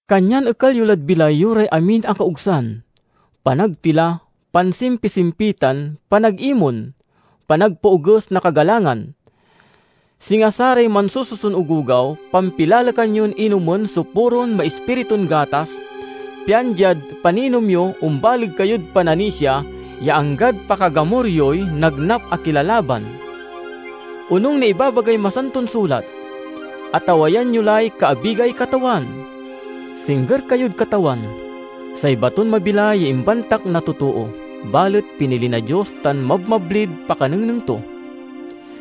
Kanyan ekal yo lad bilay yo ray amin a kaogsan, panagtila, pansimpisimpitan, panagimon, panagpaoges na kagalangan. Singa saray mansususon ogogaw, pampilalekan yon inomen so puron maispiritun gatas, pian diad paninom yo, ombaleg kayod pananisia ya anggad pakagamur yoy nagnap a kilalaban. Onung na ibabagay Masanton Sulat, "Atawayan yo lay kaabigay Katawan." Singger kayod Katawan, say baton mabilay ya imbantak na totoo, balet pinili na Dios tan mabmablid pakanengneng to.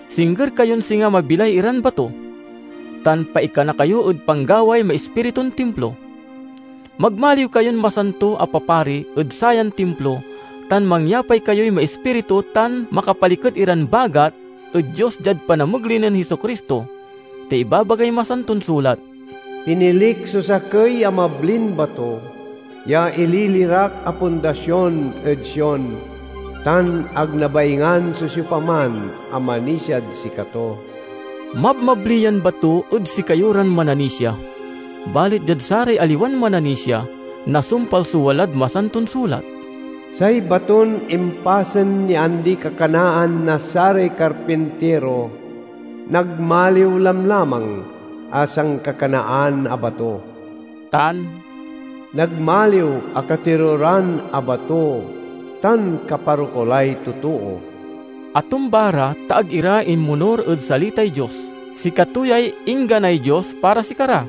Singger kayon singa mabilay iran bato, tan paikana kayo ed panggaway maispiritun timplo. Magmaliw kayon masanto a papari ed sayan timplo tan mangyapay kayoy maispiritu tan makapaliket iran bagat ed Dios diad panamegley nen Jesu-Cristo. Ta ibabagay Masanton Sulat, "Pinilik so sakey a mablin bato, ya ililirak a pundasion ed Sion; tan ag nabaingan so siopaman a manisiad sikato." Mabmabli yan bato ed sikayo ran mananisia, balet diad saray aliwan mananisia nasumpal so walad Masanton Sulat: "Say baton impasen ya andi-kakanaan na saray karpintiro, nagmaliw lamlamang a sankakanaan a bato." tan, "Nagmaliw a katiruran a bato, tan kaparokulay totoo." Atumba ra, ta ag ira inmonur ed salitay Dios; sikato yay ingganay Dios para sikara.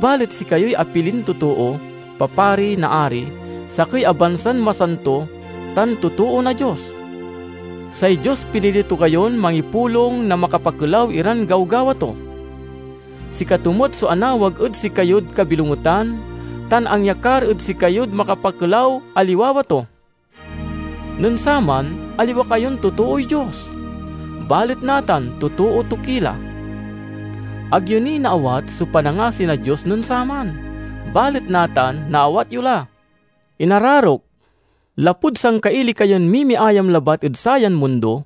Balet sikayoy apilin totoo, papari na Ari, sakey a bansan masanto, tan totoo na Dios. Say Dios pinili to kayon mangipulong na makapakelaw iran gawgawa to. Sikato met so anawag ed sikayod kabilongetan tan angyakar ed sikayod makapakelaw a liwawa to. Nen saman, aliwa kayon totooy Dios, balet natan totoo to ki la. Ag yo ni naawat so panangasi na Dios nen saman, balet natan naawat yo la. Inararok, lapud sangkaili kayon mimiayam labat ed sayan mundo,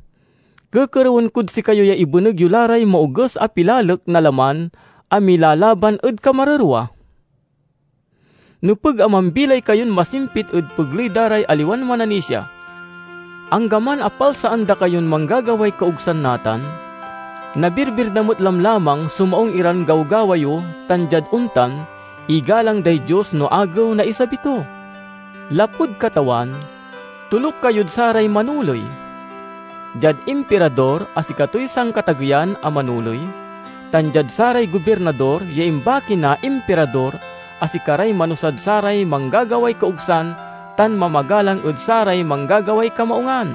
kekerewen kod sikayo ya ibeneg yo la ray maoges a pilalek na laman a milalaban ed kamarerwa. Nepeg a mambilay kayon masimpit ed pegley da ray aliwan mananisia. Anggaman a palsaan da kayon manggagaway kaogsan natan, nabirbir da met lamlamang so maung iran gawgawa yo tan diad ontan, igalang day Dios no Agew na isabi to. Lapud Katawan, toluk kayod saray manoley: diad Impirador a sikatoy sankatageyan a manoley, tan diad saray gobirnador ya imbaki na Impirador a sikaray manusad saray manggagaway kaogsan tan mamagalang ed saray manggagaway kamaungan.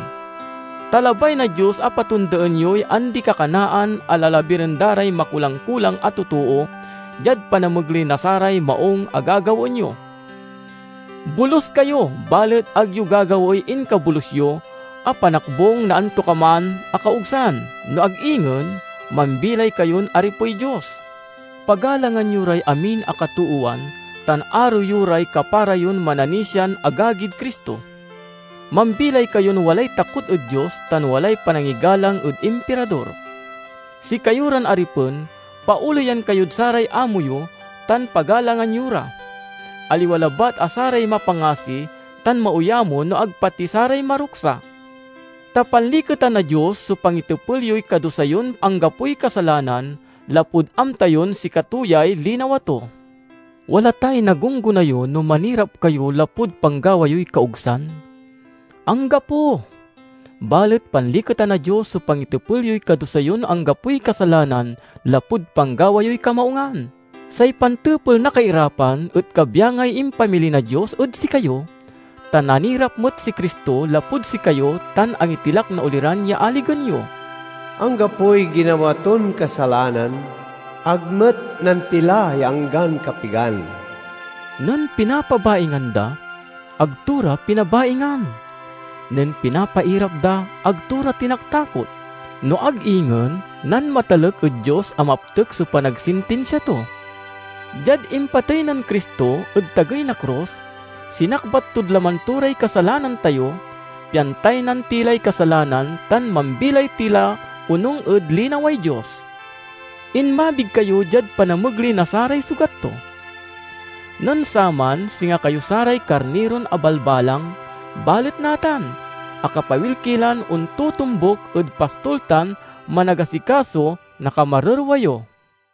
Ta labay na Dios a patondaen yoy andi-kakanaan a lalabiren da ray makulang-kulang a totoo, diad panamegley na saray maung a gagawaen yo. Bolus kayo, balet ag yo gagawaey inkabolus yo a panakbung na antokaman a kaogsan, no ag ingen mambilay kayon aripey Dios. Pagalangan yo ray amin a katoowan tan aro yo ray kapara yon mananisian agagid Cristo. Mambilay kayon walay takot ed Dios tan walay panangigalang ed Impirador. Sikayo ran aripen, paoleyan kayod saray amo yo tan pagalangan yo ra, aliwa labat a saray mapangasi tan maoyamo no ag pati saray maruksa. Ta panliketan na Dios so pangitepel yoy kadusa yon anggapoy kasalanan, lapud amta yon sikato yay linawa to. Wala tay nagunggona yo no manirap kayo lapud panggawa yoy kaogsan? Anggapo! Balet panliketan na Dios so pangitepel yoy kadusa yon anggapoy kasalanan lapud panggawa yoy kamaungan. Say pantepel na kairapan et kabyangay impamili na Dios ed sikayo; ta nanirap met si Cristo lapud sikayo tan angitilak na oliran ya aligen yo. Anggapoy ginawa ton kasalanan; ag met nantila ya anggan kapigan. Nen pinapabaingan da, ag to ra pinabaingan. Nen pinapairap da, ag to ra tinaktakot, no ag ingen nanmatalek ed Dios a maptek so panagsintinsia to. Diad impatey nen Cristo ed tagey na krus, sinakbat tod laman to ray kasalanan tayo, pian taynan ti lay kasalanan tan mambilay ti la onung ed linaway Dios. Inmabig kayo diad panamegley na saray sugat to. Nen saman singa kayo saray karniron abalbalang, balet natan akapawil ki lan ontotombuk ed Pastol tan Managasikaso na kamarerwa yo.